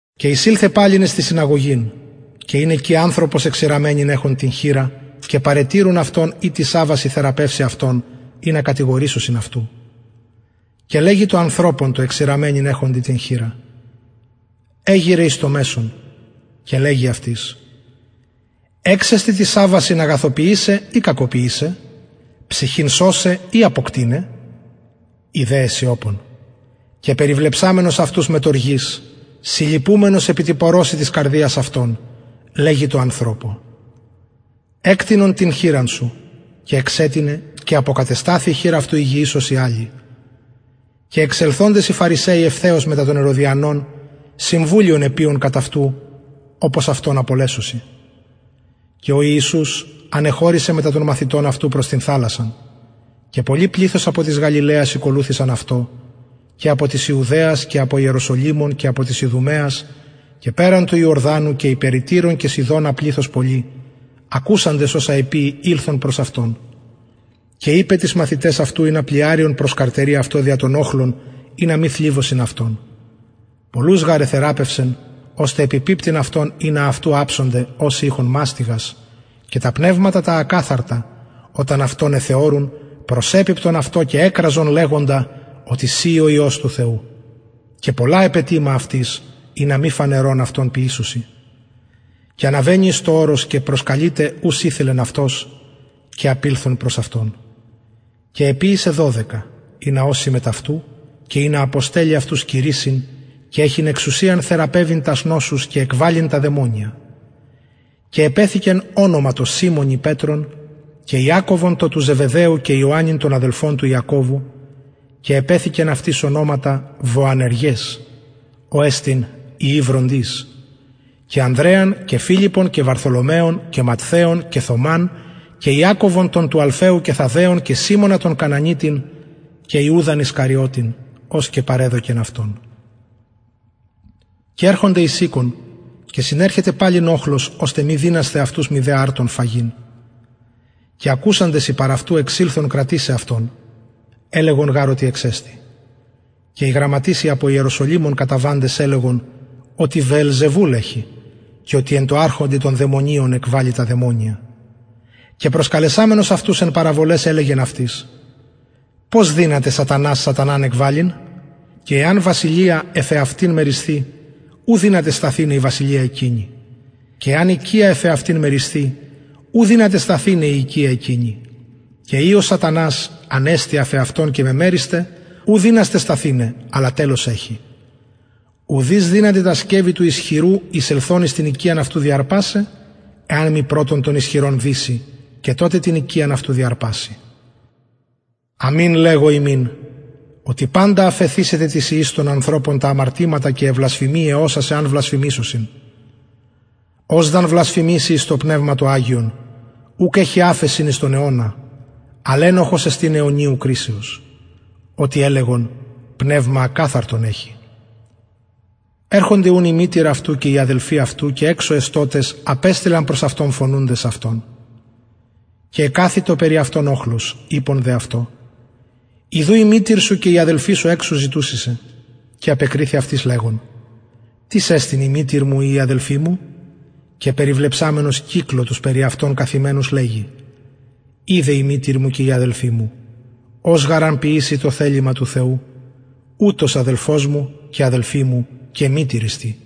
και εισηλθεν παλιν εις την συναγωγην και ην εκει ανθρωπος εξηραμμενην εχων την χειρα και παρετηρουν αυτον ει τοις σαββασιν θεραπευσει αυτον ινα κατηγορησωσιν αυτου και λεγει τω ανθρωπω τω εξηραμμενην εχοντι την χειρα εγειραι εις το μεσον και λεγει αυτοις εξεστιν τοις σαββασιν αγαθοποιησαι η κακοποιησαι ψυχην σωσαι η αποκτειναι οι δε εσιωπων και περιβλεψαμενος αυτους μετ οργης συλλυπουμενος επι τη πωρωσει της καρδιας αυτων λεγει τω ανθρωπω εκτεινον την χειρα σου και εξετεινεν και αποκατεσταθη η χειρ αυτου υγιης ως η αλλη και εξελθοντες οι φαρισαιοι ευθεως μετα των ηρωδιανων συμβουλιον εποιουν κατ αυτου οπως αυτον απολεσωσιν και ο ιησους ανεχωρησεν μετα των μαθητων αυτου προς την θαλασσαν και πολυ πληθος απο της γαλιλαιας ηκολουθησαν αυτω και απο της ιουδαιας και απο ιεροσολυμων και απο της ιδουμαιας και περαν του ιορδανου και οι περι τυρον και σιδωνα πληθος πολυ ακουσαντες οσα εποιει ηλθον προς αυτον και ειπεν τοις μαθηταις αυτου ινα πλοιαριον προσκαρτερη αυτω δια τον οχλον ινα μη θλιβωσιν αυτον πολλους γαρ εθεραπευσεν ωστε επιπιπτειν αυτω ινα αυτου αψωνται οσοι ειχον μαστιγας και τα πνευματα τα ακαθαρτα οταν αυτον εθεωρει προσεπιπτεν αυτω και εκραζεν λεγοντα οτι συ ει ο υιος του θεου και πολλα επετιμα αυτοις ινα μη φανερον αυτον ποιησωσιν και αναβαινει εις το ορος και προσκαλειται ους ηθελεν αυτος και απηλθον προς αυτον και εποιησεν δωδεκα ινα ωσιν μετ αυτου και ινα αποστελλη αυτους κηρυσσειν και εχειν εξουσιαν θεραπευειν τας νοσους και εκβαλλειν τα δαιμονια και επεθηκεν τω σιμωνι ονομα πετρον και ιακωβον τον του ζεβεδαιου και ιωαννην τον αδελφον του ιακωβου και επεθηκεν αυτοις ονοματα βοανεργες ο εστιν υιοι βροντης και ανδρεαν και φιλιππον και βαρθολομαιον και ματθαιον και θωμαν και ιακωβον τον του αλφαιου και θαδδαιον και σιμωνα τον κανανιτην και ιουδαν ισκαριωτην ος και παρεδωκεν αυτον και ερχονται εις οικον και συνερχεται παλιν οχλος ωστε μη δυνασθαι αυτους μητε αρτον φαγειν και ακουσαντες οι παρ αυτου εξηλθον κρατησαι αυτον ελεγον γαρ οτι εξεστη και οι γραμματεις οι απο ιεροσολυμων καταβαντες ελεγον οτι βεελζεβουλ εχει και οτι εν τω αρχοντι των δαιμονιων εκβαλλει τα δαιμονια και προσκαλεσαμενος αυτους εν παραβολαις ελεγεν αυτοις πως δυναται σατανας σαταναν εκβαλλειν και εαν βασιλεια εφ εαυτην μερισθη ου δυναται σταθηναι η βασιλεια εκεινη και εαν οικια εφ εαυτην μερισθη ου δυναται σταθηναι η οικια εκεινη και ει ο σατανας ανεστη εφ εαυτον και μεμερισται ου δυναται σταθηναι αλλα τελος εχει ουδεις δυναται τα σκευη του ισχυρου εισελθων εις την οικιαν αυτου διαρπασαι εαν μη πρωτον τον ισχυρον δηση και τοτε την οικιαν αυτου διαρπαση αμην λεγω υμιν οτι παντα αφεθησεται τα αμαρτηματα τοις υιοις των ανθρωπων και βλασφημιαι οσας αν βλασφημησωσιν ος δ αν βλασφημηση εις το πνευμα το αγιον ουκ εχει αφεσιν εις τον αιωνα αλλ ενοχος εστιν αιωνιου κρισεως οτι ελεγον πνευμα ακαθαρτον εχει ερχονται ουν οι αδελφοι και η μητηρ αυτου και εξω εστωτες απεστειλαν προς αυτον φωνουντες αυτον και εκαθητο οχλος περι αυτον ειπον δε αυτω ιδου η μητηρ σου και οι αδελφοι σου και αι αδελφαι σου εξω ζητουσιν σε και απεκριθη αυτοις λεγων τις εστιν η μητηρ μου η οι αδελφοι μου και περιβλεψαμενος κυκλω τους περι αυτον καθημενους λεγει ιδε η μητηρ μου και οι αδελφοι μου ος γαρ αν ποιηση το θελημα του θεου ουτος αδελφος μου και αδελφη μου και μητηρ εστιν